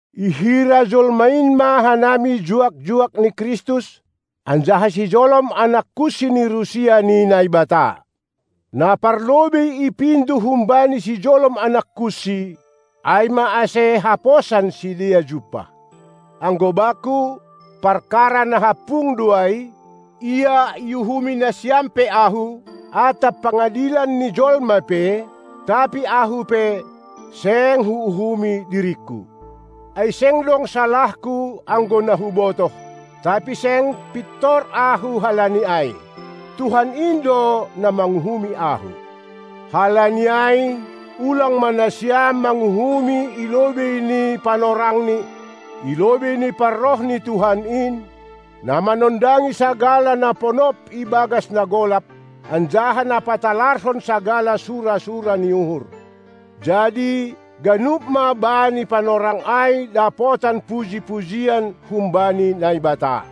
Ihira jolma in ma hanami juak-juak ni Kristus anjaha sijolom anak-kunsi ni rusia ni Naibata. Na parlobei ipindo humbani sijolom anak kunsi, ai ma ase haposan sidea jumpah. Anggo bakku, parkara na hampung do ai, ia iuhumi nasiam pe ahu, atap pangadilan ni jolma pe; tapi ahu pe, seng huuhumi diringku. Ai seng dong salahku, anggo na hubotoh, tapi seng pintor ahu halani ai, Tuhan in do na manguhumi ahu. Halani ai ulang ma nasiam manguhumi ilobei ni panorangni, ilobei ni parroh ni Tuhan in, na manondangi sagala na ponop ibagas na golap, anjaha na patalarhon sagala sura-sura ni uhur. Jadi ganup ma bani panorang ai dapotan puji-pujian humbani Naibata.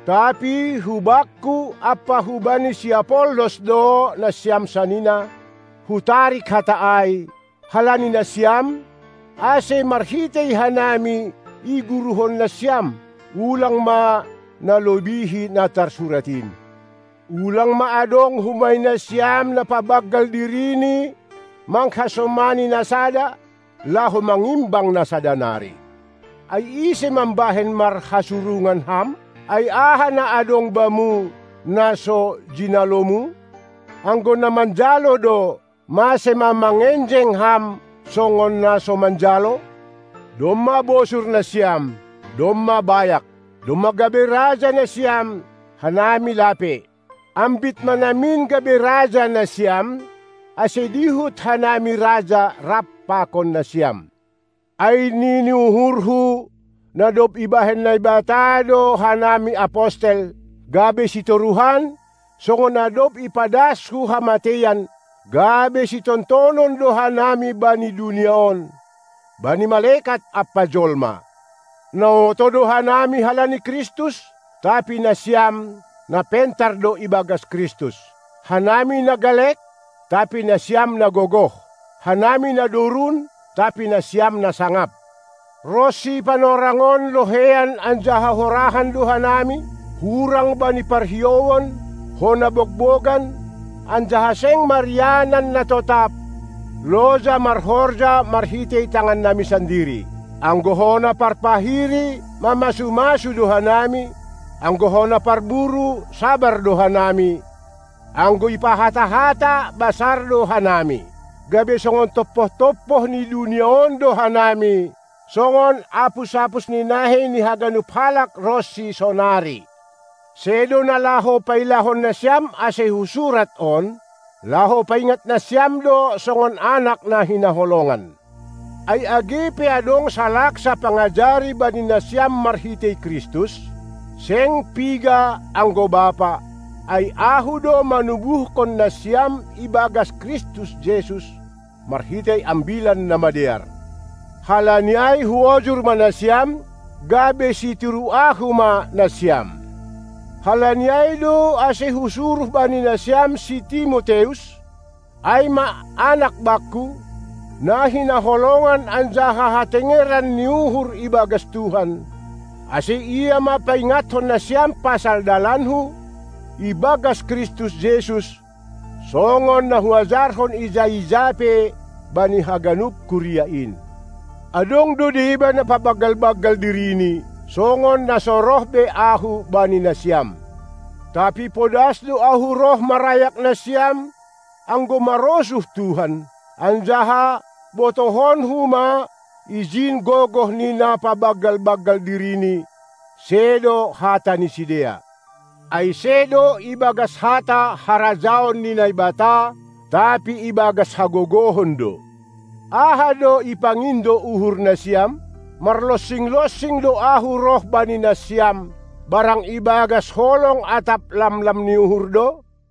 Tapi hubakku ampa hubani si Apollos do, nasiam sanina, hutarik hata ai, halani nasiam, ase marhitei hanami iguruhon nasiam, ulang ma nalobihi na tarsurat in: Ulang ma adong humbani nasiam na pabanggal dirini manghasomani na sada, laho mangimbang na sada nari. Ai ise mambahen marhasurungan ham? Ai aha na adong bamu, na so jinalomu? Anggo na manjalo do, mase ma mangenjeng ham songon na so manjalo? Domma bosur nasiam, domma bayak. Domma gabe raja nasiam, hanami lape. Ambit ma namin gabe raja nasiam, ase dihut hanami raja rap pakon nasiam! Ai nini uhurhu, na dob ibahen Naibata do hanami apostel, gabe sitoruhan, songon na dob ipadas hu hamateian; gabe sitontonan do hanami bani dunia on, bani malekat ampa jolma. Na oto do hanami halani Kristus, tapi nasiam, na pentar do ibagas Kristus. Hanami na galek, tapi nasiam na gogoh. Hanami na dorun, tapi nasiam na sangap. Ronsi panorang on loheian anjaha horahan do hanami, hurang bani parhiouan, hona bogbogan anjaha seng marianan na totap, loja marhorja marhitei tangannami sandiri. Anggo hona parpahiri mamasu-masu do hanami, anggo hona parburu, sabar do hanami, anggo ipahata-hata, basar do hanami. Gabe songon tompoh-tompoh ni dunia on do hanami, songon apus-apus ni nahei ni haganup halak ronsi sonari. Sedo na laho pailahon nasiam ase husurat on, laho paingat nasiam do songon anak na hinaholongan. Ai age pe adong salaksa pangajari bani nasiam marhitei Kristus, seng piga anggo bapa, ai ahu do manubuhkon nasiam ibagas Kristus Jesus, marhitei Ambilan Namadear. Halani ai huojur ma nasiam, gabe sitiru ahu ma nasiam! Halani ai do ase husuruh bani nasiam si Timoteus, ai ma anak bakku, na hinaholongan anjaha hatengeran ni uhur ibagas Tuhan, ase ia ma paingatkon nasiam pasal dalanku ibagas Kristus Jesus, songon na huajarhon ija-ija pe bani haganup kuria in. Adong do deba na pabanggal-banggal dirini, songon na so roh be ahu bani nasiam. Tapi podas do ahu roh marayak nasiam, anggo marosuh Tuhan, anjaha botohonku ma ijin gogoh ni na pabanggal-banggal dirini, sedo hata ni sidea. Ai sedo ibagas hata harajaon ni Naibata, tapi ibagas hagogohon do. Aha do ipangindo uhur nasiam? Marlonsing-lonsing do ahu roh bani nasiam, barang ibagas holong atap lamlam ni uhur do?